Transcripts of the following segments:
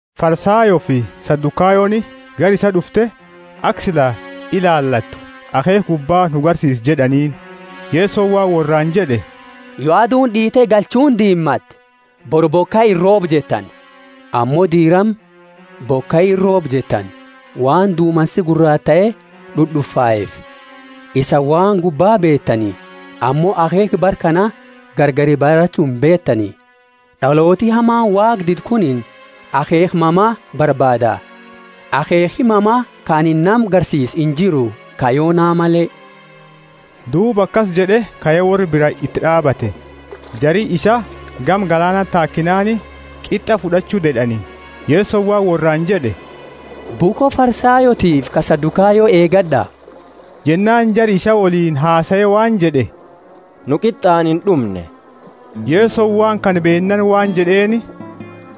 Farisayoofi Sadukayoni gara isaa d'ufte aka sila ilaalattu, Akheekha gubba nu agarsiisi jed'aniini. Yesoni waan worraani jed'e, Yo aduuni d'iite galchuuni diimate, bori bokai irroobu jettani. Ammo diirama, Bokai irrooba jettani, waan dumansi guraatae d'ud'ufaeefi. Isaani waan gubba beetani, ammo akheekha bara kana gargari barachu imbeetani. D'alooti hamani Waaqa didu kunini akheekha mama, barbaada akheekhi mama ka anini nama garsiisu injiru ka Yona male. Duuba akasi jed'e kae worra bira iti d'aabate. Jari isaa gama galaanati taakinaani, qit'a fud'achu ded'ani. Yesoni waan worraani jed'e, Bukho Farisayootiifi ta Sadukayo eegad'a. Jennaani jari isaa woliini hasae waan jed'e, Nu qit'aani ind'umne. Yesoni waan kana beennaani waan jed'eeni,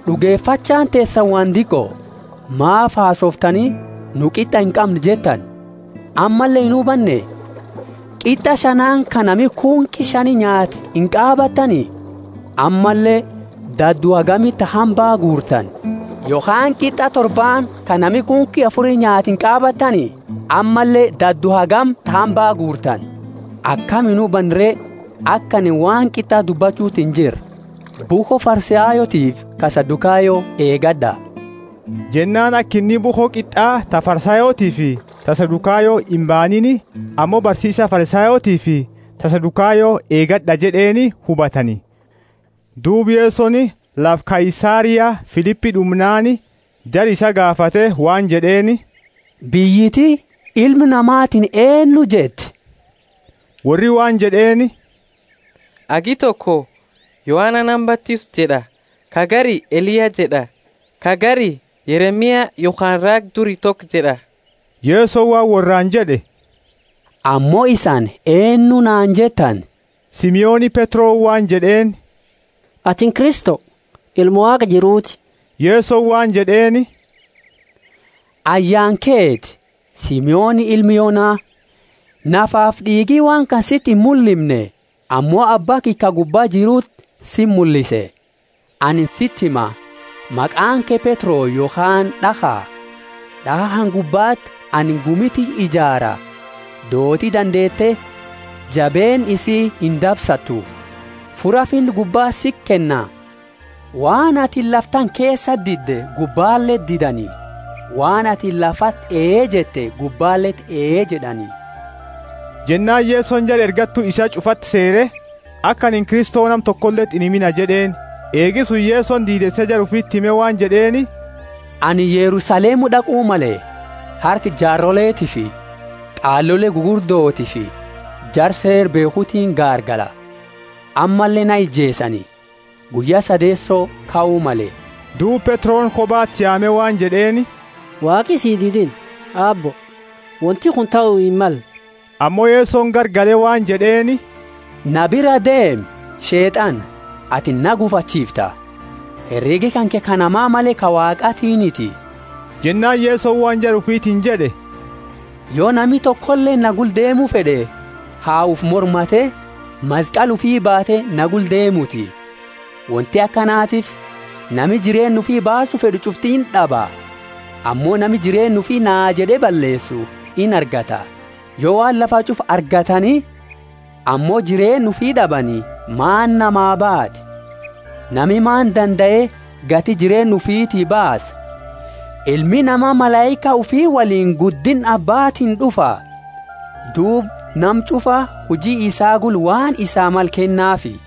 D'ugefachaani teesani waan diqo. Maafi hasooftani, Nu qit'a inqamnu jettani? Ammalle inhubanne? Qit'a shanaani ka nami kunki shani nyaate inqaabatani? Ammalle dadu hagami ta hambaa guurtani? Yokhaani qit'a torbaani ka nami kunki afuri nyaate inqaabatani? Ammalle dadu hagani ta hambaa guurtani? Akami inhubanne re aka anini waan qit'a dubbachuti injirre? Bukho Farisayootiifi ta Sadukayo eegad'a. Jennaani aka inni bukho qit'a ta Farisayootiifi ta Sadukayo imbaaniini, ammo barsiisa Farisayootiifi ta Sadukayo eegad'a jed'eeni hubatani. Duuba Yesoni lafa Kaisaria Filipi d'umnaani, jara isaa gaafate waan jed'eeni, Biyyiti, Ilmi Namatiini eennu jetti? Worri waan jed'eeni, Hagi toko, Yohana nama batisu jed'a, ka gari, Eliya jed'a, ka gari, Yeremia yokhaani raaga duri toko jed'a. Yesoni waan worraani jed'e, Ammo isani eennu naani jettani? Simoni Petroni waan jed'eeni, Atini Kristo, Ilma Waaqa jiruuti. Yesoni waan jed'eeni, Ayyaani keti, Simoni, ilma Yona. Nafafi d'iigi waan kana siti imullimne, ammo Abba kiyya ka gubba jiruti siti mullise. Anini siti hima: Maqaani ke Petro yokhaani d'akha, d'akha kana gubbati anini gumi tiyya ijaara. Dooti dandeete jabeenna isii indabsattu. Fura Finna gubba siti kenna; waan atini lafa tana keesati didde gubbaleti didani, waan atini lafati ee jette gubbaleti ee jed'ani. Jennaani Yesoni jara ergattu isaa ch'ufati seere, Aka anini Kristo nama tokoleti inhimina jed'eeni. Eegi suni Yesoni diideese jara ufiti hime waan jed'eeni, Anini Yerusalemu d'aqu male. Harka jaaroletiifi qaalole gugurdotiifi jara Seera beekhutiini gaargala. Ammalle na ijeesani, guyya sadeeso kau male. Duuba Petroni kobati yaame waan jed'eeni, Waaqi si didinna, Aabbo. Wonti kuni tahu himmalle. Ammo Yesoni garagale waan jed'eeni, Na biraa deemi, Sheet'ana; atini na gufachiifta, heregi kanke ka nama male ka Waaqatiiniti. Jennaani Yesoni waan jara ufitiini jed'e, Yo nami tokoleeni na gula deemu fed'e ha ufi mormate, maskali ufi baate na gula deemuti. Wonti akanatiifi nami jireenna ufi baasu fed'u ch'ufti ind'aba; ammo nami jireenna ufi naa jed'e balleesu inargata. Yo waan lafa ch'ufa argatani ammo jireenna ufii d'abani, maani namaa baati? Nami maani dandae gati jireenna ufiti baasa? Ilmi Nama malaika ufi woliini guddinna Abbaatiini d'ufa, duuba nama ch'ufa huji isaa gula waan isaa male kennaafi.